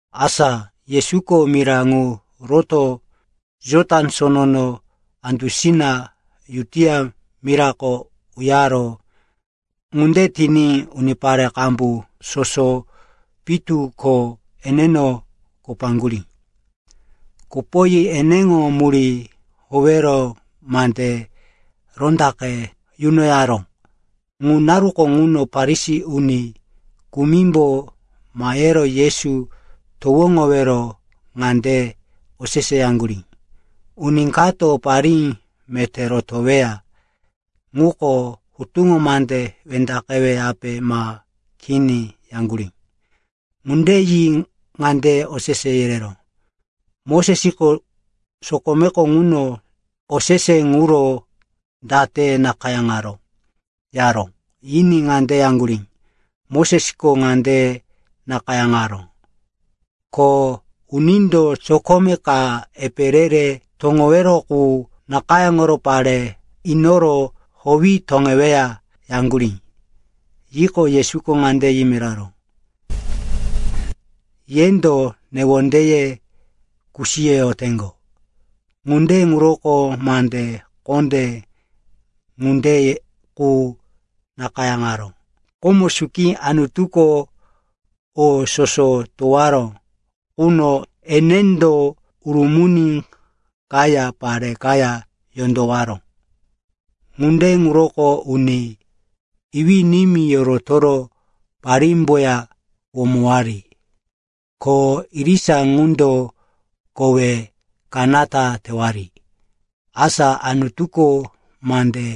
Asa Yesuko mira ŋu rotoro Jotan Sono andusina Judia mirako uyaró. Ŋunde tiní unipare qambu soso pitu ko eneno kopoyaŋgurí. Kopoyi eneŋo murí howero mande rondaqe yunoyaró. Ŋu naruko ŋuno Farisi uni kumimbo mahero Yesu towoŋowero ŋande oseseyaŋgurí, “Uni kato parí meté rotoweya ŋuko hutuŋo mande wendaqeweyape ma kini?” yaŋgurí. Ŋunde yi ŋande osese yereró, “Mosesko sokomeko ŋuno osese ŋuro date nakayáŋaró?” yaró. Yiní ŋande yaŋgurí, “Mosesko ŋande nakayáŋaró, ko unindo sokome ka epe re-re toŋowero qu nakayáŋoro pare inoro howi toŋeweya,” yaŋgurí. Yiqo, Yesuko ŋande yimiraró, “Yendo newondeye kusiyoyoteŋgo. Ŋunde ŋuroko mande kondé ŋunde qu nakayáŋaró. Komo suki Anutuko o soso towaró quno enendo ‘urumuni kaya, pare kaya yondowaró.’ ‘Ŋunde ŋuroko uni iwí-nimí yorotoro parímboya womowari, ko irisa ŋundo kowe kanata tewari.’ Asa Anutuko mande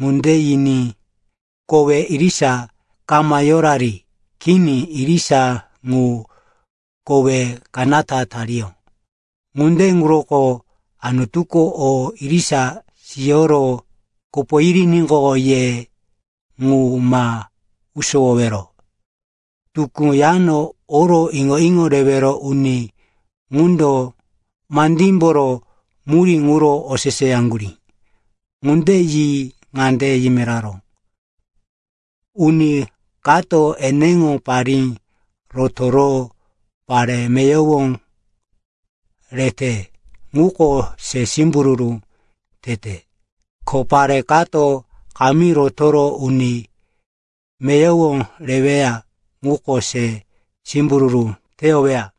ŋunde yiní kowe irisa kama yorari. Kini. Irisa ŋu kowe kanata tariyó. Ŋunde ŋuroko Anutuko o irisa siyoro kopo yiriníqo, ye ŋu ma usowowero.” Tukú yano oro iŋo-iŋo rewero uni ŋundo mandímboro murí ŋuro oseseyaŋgurí. Ŋunde yi ŋande yimiraró, “Uni kato eneŋo parí rotoro pare meyowo rete, ŋuko se simbururu tete. Ko pare kato kamí rotoro uni meyowo reweya, ŋuko se simbururu teyoweya.”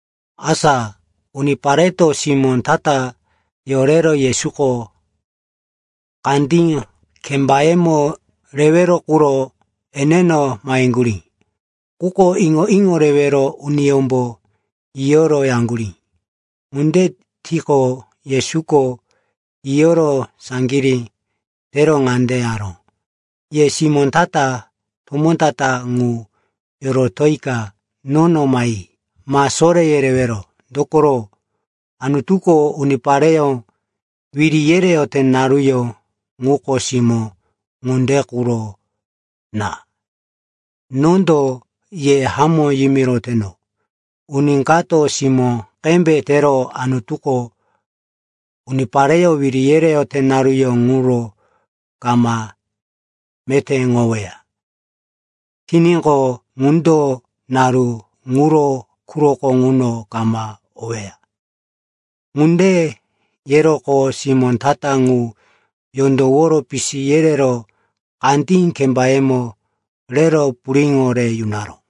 Asa unipareto simó ta-ta yorero Yesuko kandí kembayemo rewero quro eneno maheŋgurí. Quko iŋo-iŋo rewero uniyómbo yiyo yaŋgurí. Ŋunde tiqo, Yesuko yiyoro saŋgirí tero ŋande yaró, “Ye simó ta-ta tomó ta-ta ŋu yorotika nono mahe, ma soré yerewero. Dokoro Anutuko unipareyó wiri yereyote naruyó ŋuko simó ŋunde quro na. Nondo ye hamó yimiroteno, uni kato simó qembe tero Anutuko unipareyó wiri yereyote naruyó ŋuro kama metéŋoweya tiníqo, ŋundo naru ŋuro quroko ŋuno kama oweya.” Ŋunde yeroqo simó ta-ta ŋu yondowo pisi yerero kandí kembayemo rero puriŋo re yunaró.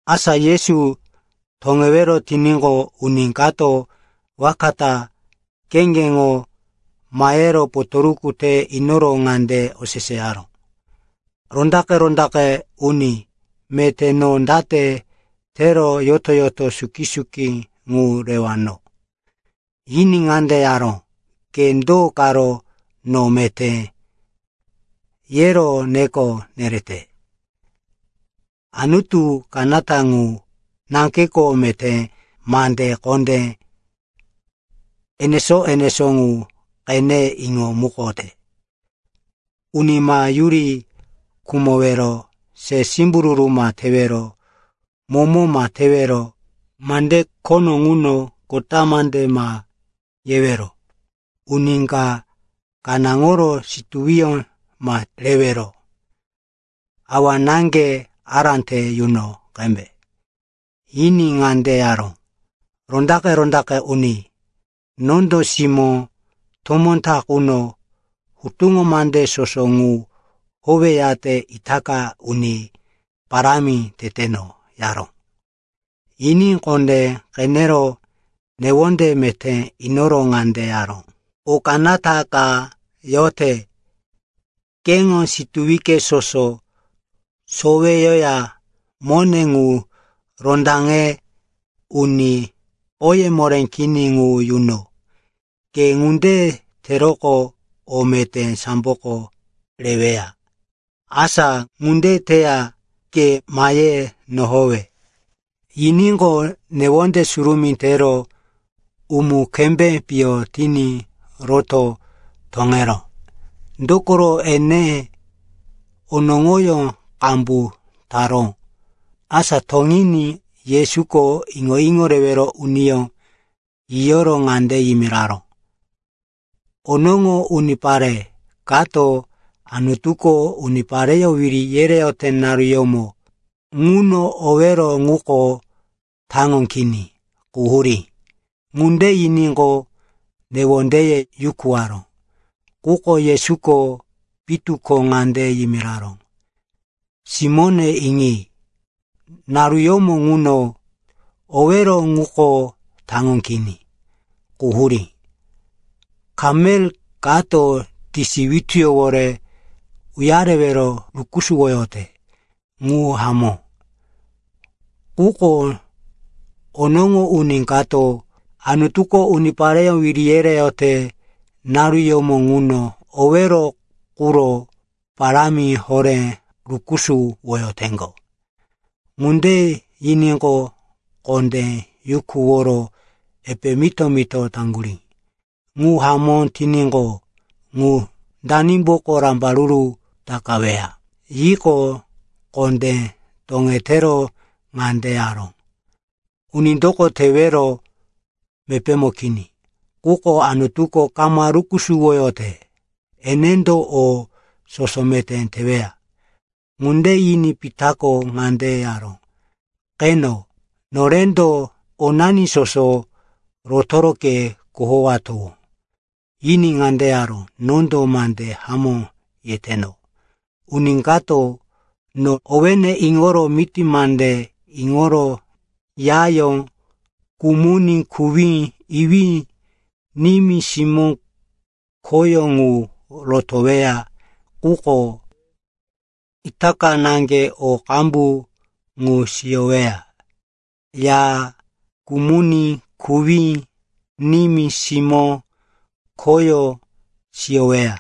Asa Yesu toŋewero tiníqo, uni kato waka ta kheŋgeŋo mahe potoruku re inoro ŋande oseseyaró, “Rondaqe-rondaqe uni meté, no date tero yoto-yoto suki-suki ŋu rewano?” Yiní ŋande yaró, “Ke do karo, no meté, yero neko nerete? Anutu kanata ŋu naŋgeko meté. Mande kondé enesó-enesó ŋu qene iŋomukote: uni ma yuri khumowero, se simbururu ma tewero, momo ma tewero, mande khono ŋuno kota mande ma yewero, uni ka kanáŋoro situwiyó ma rewero, awa-náŋge ará te yuno qembe.” Yiní ŋande yaró, “Rondaqe-rondaqe uni, nondo simó tomó ta quno hutuŋo mande soso ŋu howeyate itaka uni parámi teteno,” yaró. Yiní kondé qenero newonde meté inoro ŋande yaró, “O kanata ka yote. Keŋo situwi soso soweyoya mone ŋu rondaŋe uni oye moré kini ŋu yuno. Ke ŋunde teroqo, o meté samboko reweya. Asa ŋunde teya ke mahe nohowe.” Yiníqo, newonde surumí tero umu-kembé piyo tiní roto toŋeró, dokoro, ene onoŋoyó qambu taró. Asa toŋiní Yesuko iŋo-iŋo rewero uniyó yiyoro ŋande yimiraró, “Onoŋo unipare kato Anutuko unipareyó wiri yereyote naruyómo ŋuno owero ŋuko taŋo kini, quhurí.” Ŋunde yiníqo, newondeye yukuwaró. Quko Yesuko pitu ko ŋande yimiraró, “Simóne iŋi, naruyómo ŋuno owero ŋuko taŋo kini, quhurí. Kamel kato tisi wituyówore uyarewero rukusuwoyote. Ŋu hamó. Quko onoŋo uni kato Anutuko unipareyó wiri yereyote naruyómo ŋuno owero quro parámi horé rukusuwoyoteŋgo.” Ŋunde yiníqo, kondé yukuworo epe mito-mito taŋgurí, “Ŋu hamó tiníqo, ŋu danimboko rambaruru takaweya?” Yiqo, kondé toŋetero ŋande yaró, “Unindoko tewero mepémo kini. Quko Anutuko kama rukusuwoyote. Enendo o soso meté teweya.” Ŋunde yiní Pitako ŋande yaró, “Qeno, norendo onani soso rotoro ke kohowatowó.” Yiní ŋande yaró, “Nondo mande hamó yeteno. Uni kato no owéne iŋoro miti mande iŋoro yayó, kumuní, kuwí, iwí, nimí, simó, khoyó ŋu rotoweya quko itaka naŋge o qambu ŋu siyoweya: ya, kumuní, kuwí, nimí, simó, khoyó siyoweya.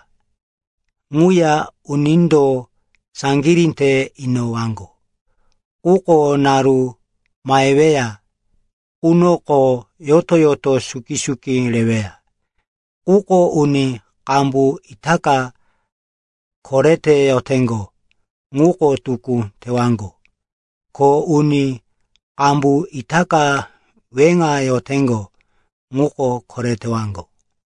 Ŋuya unindo saŋgirí te inowaŋgo. Quko naru maheweya qunoko yoto-yoto suki-suki reweya. Quko uni qambu itaka korete yoteŋgo, ŋuko tukú tewaŋgo. Ko uni qambu itaka weŋa yoteŋgo, ŋuko koretewaŋgo.”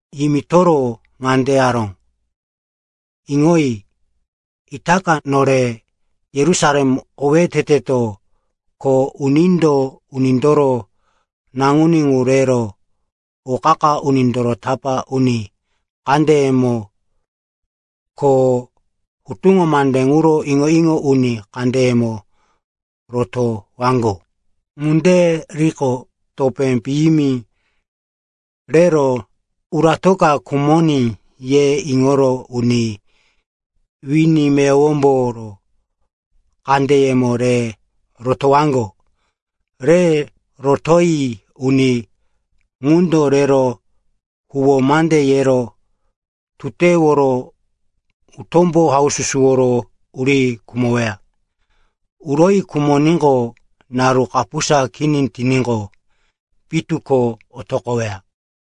Yimitoro ŋande yaró, “Iŋoyi, itaka nore Yerusalem owé teteto. Ko unindo Unindoro Naŋuní ŋu rero o qa-qa unindoro tapá uni kandeyemo ko hutuŋo mande ŋuro iŋo-iŋo uni kandeyemo rotowaŋgo. Ŋunde riqo, topé piyimi rero, uratoka khumoní, ye iŋoro uni wini meyowomboro kandeyemo re rotowaŋgo. Re rotoyi uni ŋundo rero huwó mande yero tuteworo utómbo haususuworo uri khumoweya. Uroyi khumoníqo, naru kapusa kini tiníqo, pitu ko otoqoweya.”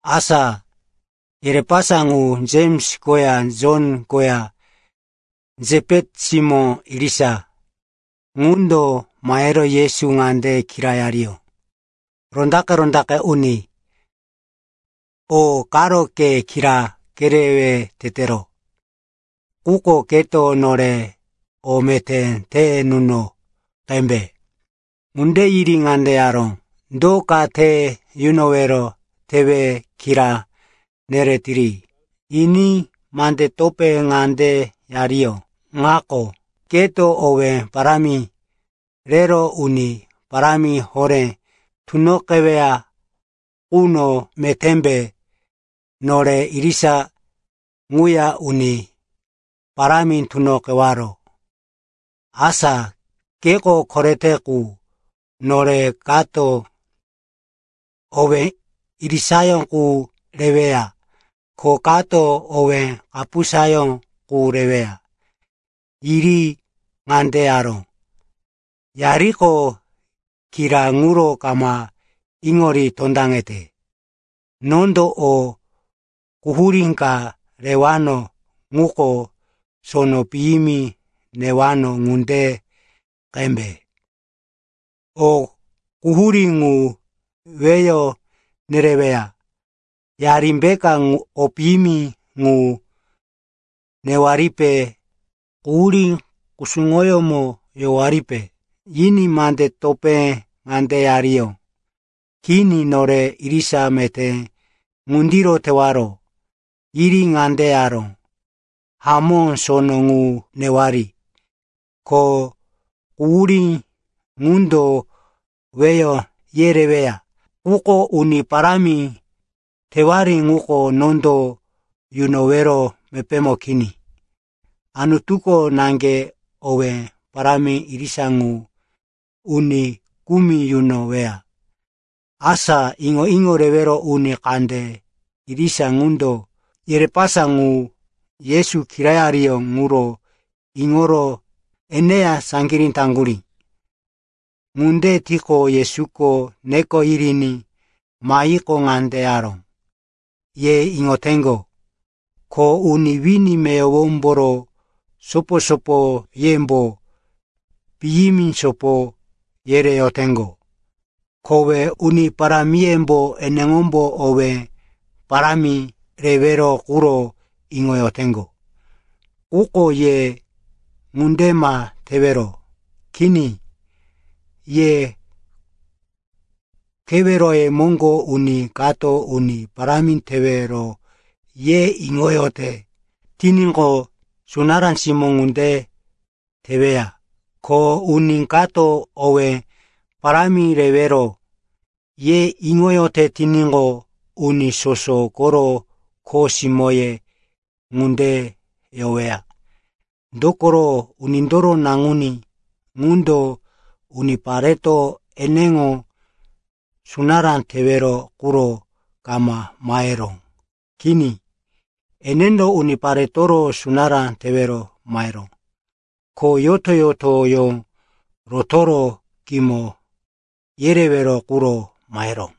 Asa yerepasa ŋu, Jems koya Jon koya, Sepeti simó irisa ŋundo, mahero Yesu ŋande kirayariyó, “Rondaqe-rondaqe uni, o karo ke kira kerewe tetero, quko keto nore o meté te nuno qembe.” Ŋunde yiri ŋande yaró, “Do ka te yunowero tewe kira neretiri?” Yiní mande topé ŋande yariyó, “Ŋako. Keto owé parámi rero uni parámi horé tunoqeweya quno metémbe nore irisa ŋuya uni parámi tunoqewaro. Asa keko korete qu, nore kato owé irisayó qu reweya ko kato owé kapusayó qu reweya.” Yiri ŋande yaró, “Yariko kira ŋuro kama iŋori tondaŋete. Nondo o quhurí ka rewano ŋuko sono piyimi newano ŋunde qembe. O quhurí ŋu weyo nereweya. Yarimbeka o piyimi ŋu newaripe, quhurí kusuŋoyómo yowaripe?” Yiní mande topé ŋande yariyó, “Kini, nore irisa meté ŋundiro tewaro.” Yiri ŋande yaró, “Hamó, sono ŋu newari. Ko quhurí ŋundo weyo yereweya. Quko uni parámi tewari ŋuko nondo yunowero mepémo kini. Anutuko naŋge owé parámi irisa ŋu uni kumi yunoweya.” Asa iŋo-iŋo rewero uni kande irisa qundo yerepasa ŋu Yesu kirayariyó ŋuro iŋoro eneya saŋgirí taŋgurí. Ŋunde tiqo, Yesuko neko yiriní mahiqo, ŋande yaró, “Ye iŋoteŋgo, ko uni wini meyowomboro sopo-sopoyembo piyimi sopo yereyoteŋgo. Kowe uni parámiyembo eneŋombo owé parámi rewero quro iŋoyoteŋgo. Quko ye ŋunde ma tewero. Kini, ye keweroye moŋgo uni kato uni parámi tewero ye iŋoyote tiníqo, sunará simó ŋunde teweya. Ko uni kato owé parámi rewero ye iŋoyote tiníqo, uni soso koro kho simóye ŋunde yoweya. Dokoro Unindoro Naŋuní ŋundo unipareto eneŋo sunará tewero quro kama maheró. Kini, enendo uniparetoro sunará tewero maheró, ko yoto-yotoyó rotoro kimo yerewero quro maheró.”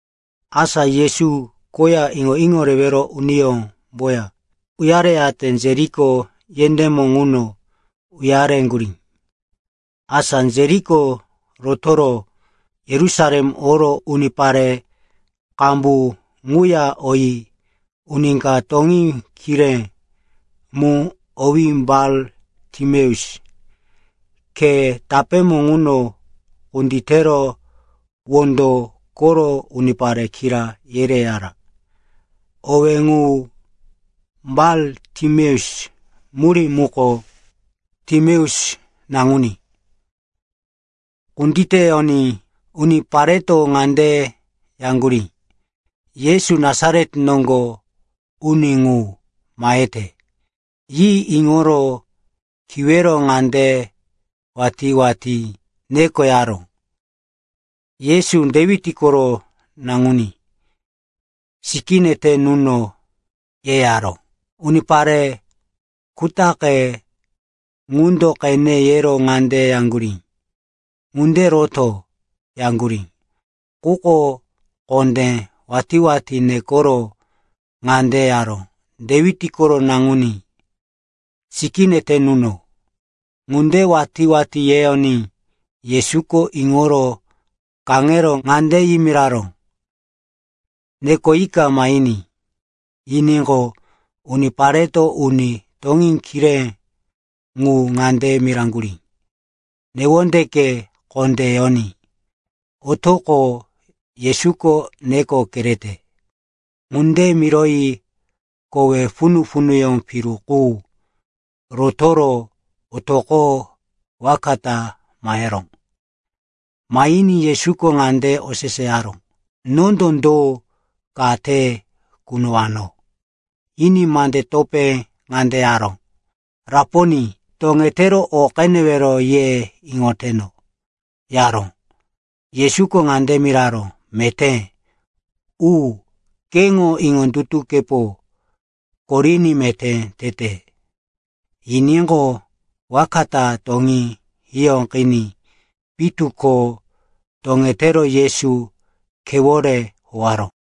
Asa Yesu koya iŋo-iŋo rewero unindoya uyareyate Jeriko yendémo ŋuno uyareŋgurí. Asa Jeriko rotoro Yerusalem oro unipare qambu ŋuya oyi uni ka toŋí kiré mu, owí Bar-Timeus, khe tapémo ŋuno kunditero wondo koro unipare kira yereyara. (Owé ŋu Bar-Timeus murí muko “Timeus naŋuní.”) Kunditeyoní unipareto ŋande yaŋgurí, “Yesu, Nasaret noŋgo uni ŋu, mahete,” yi iŋoro kiwero ŋande watí-watí nekoyaró, “Yesu, Dewit koro naŋuní, sikíne te nuno,” yeyaró. Unipare kutaqe ŋundo qene yero ŋande yaŋgurí, “Ŋunde roto!” yaŋgurí. Quko kondé watí-watí nekoro ŋande yaró, “Dewit koro naŋuní, sikíne te nuno.” Ŋunde watí-watí yeyoní Yesuko iŋoro kaŋero ŋande yimiraró, “Nekoyika mahiní.” Yiníqo, unipareto uni toŋí kiré ŋu ŋande miraŋgurí, “Newondeke kondé yoní, otoqo. Yesuko neko kerete.” Ŋunde miroyi kowe punu-punu piru qu rotoro otoqoro waka ta maheró. Mahiní Yesuko ŋande oseseyaró, “Nondo do ka te kunowano?” Yiní mande topé ŋande yaró, “Raponi, toŋetero o qenewero ye iŋoteno,” yaró. Yesuko ŋande miraró, “Meté u. Keŋo iŋondutukepo koriní meté tete.” Yiníqo, waka ta toŋí hiyóqiní pitu ko toŋetero Yesu khewore howaró.